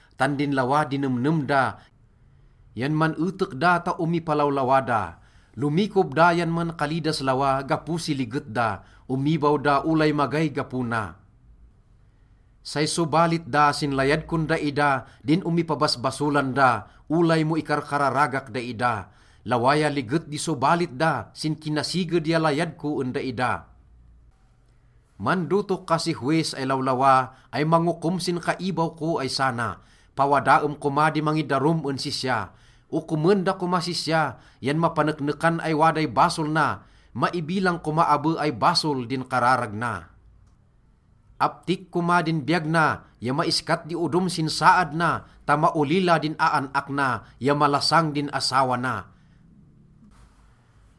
Tan din lawa di nemnem da yan man-etek da ta omipalawlawa da. Lomikob da yan mankali das lawa gapo si liget da, omibaw da olay magay gapo na. Say sobalit da sin layad kon daida din omipabasbasolan da, olay mo ikarkararagak daida. Lawa ya liget di sobalit da sin kinasiged ya layad ko en daida. Mandotok ka si howis ay lawlawa ay mangokom sin kaibaw ko ay sana, pawadaem koma di mangidarum en sisya. Okomen da komas sisya yan mapaneknekan ay waday basol na, maibilang koma abe ay basol din kararag na. Aptik koma din biyag na ya maiskat di odom sin saad na ta maolila din aan-ak na ya malasang din asawa na.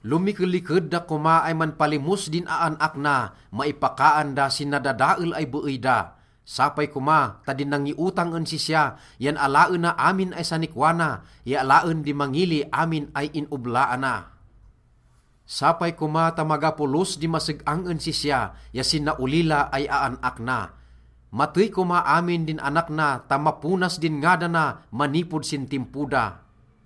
Lomikeliked da koma ay manpalimos din aan-ak na, maipakaan da sin nadadael ay beey da. Sapay koma ta din nangiotang en sisya yan alaena amin ay sanikwa na ya alaen di mangili amin ay in-oblaana. Sapay koma ta maga polos di maseg-ang en sisya ya sin naolila ay aan-ak na. Matey koma amin din anak na ta maponas din ngadana manipod sin timpo da.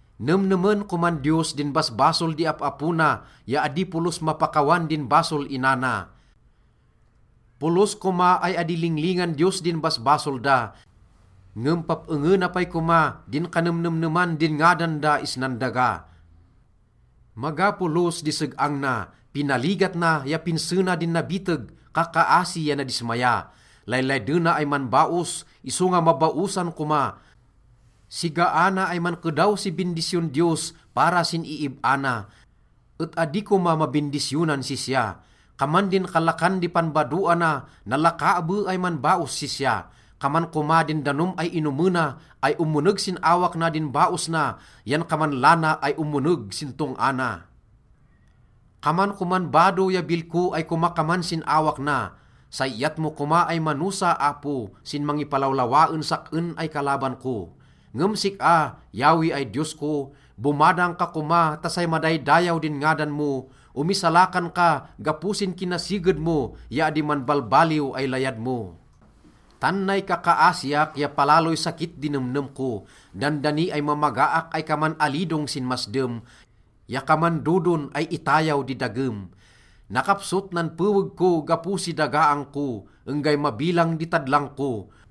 Nemnemen koman Diyos din basbasol di ap-apo na ya adi polos mapakawan din basol ina na. Polos koma ay adi linglingan Diyos din basbasol da, ngem pap-engena pay koma di kanemnemneman din ngadan da isnan daga. Maga polos di seg-ang na, pinaligat na ya pinse na din nabiteg, kakkaasi ya nadismaya. Laylaydena ay manbaos, isonga mabaosan koma, sigaana ay mankedaw si bindisyon Diyos para sin iib-a na, et adi koma mabindisyonan sisya. Kaman din kalakan di panbadoana, nalaka abe ay manbaos sisya. Kaman koma din danom ay inomena ay omoneg sin awak na din baos na yan kaman lana ay omoneg sin tong-a na. Kaman koman bado ya bilko ay komakaman sin awak na. Say iyat mo koma ay manosa, Apo, sin mangipalawlawa en sak-en ay kalaban ko. Ngem sik-a, Yahweh ay Diyos ko, bomadang ka koma ta say madaydayaw din ngadan mo, omisalakan ka gapo sin kinasiged mo ya adi manbalbaliw ay layad mo. Tan nay kakkaasiak ya palaloy sakit di nemnem ko. Dandani ay mamagaak ay kaman alidong sin masdem ya kaman dodon ay itayaw di dagem. Nakapsot nan peweg ko gapo si dagaang ko, enggay mabilang di tadlang ko.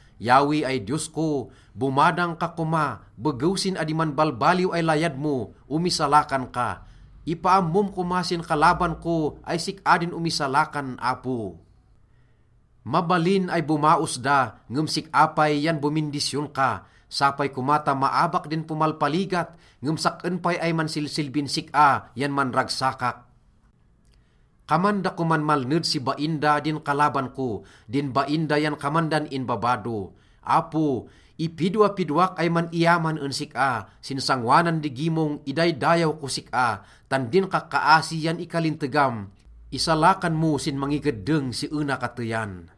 Yahweh ay Diyos ko, bomadang ka koma, begew sin adi manbalbaliw ay layad mo, omisalakan ka. Ipaammom koma sin kalaban ko ay sik-a din omisalakan, Apo. Mabalin ay bomaos da, ngem sik-a pay yan bomindisyon ka. Sapay koma ta maabak din pomalpaligat, ngem sak-en pay ay mansilsilbin sik-a yan manragsakak. Kaman da koman malned si bain da din kalaban ko, din bain da yan kaman dan inbabado. Apo, ipidwapidwak ay man-iyaman en sik-a, sin sangoanan di gimong, idaydayaw kos sik-a. Tan din kakkaasi yan ikalintegam, isalakan mo sin mangikeddeng si ena kateyan.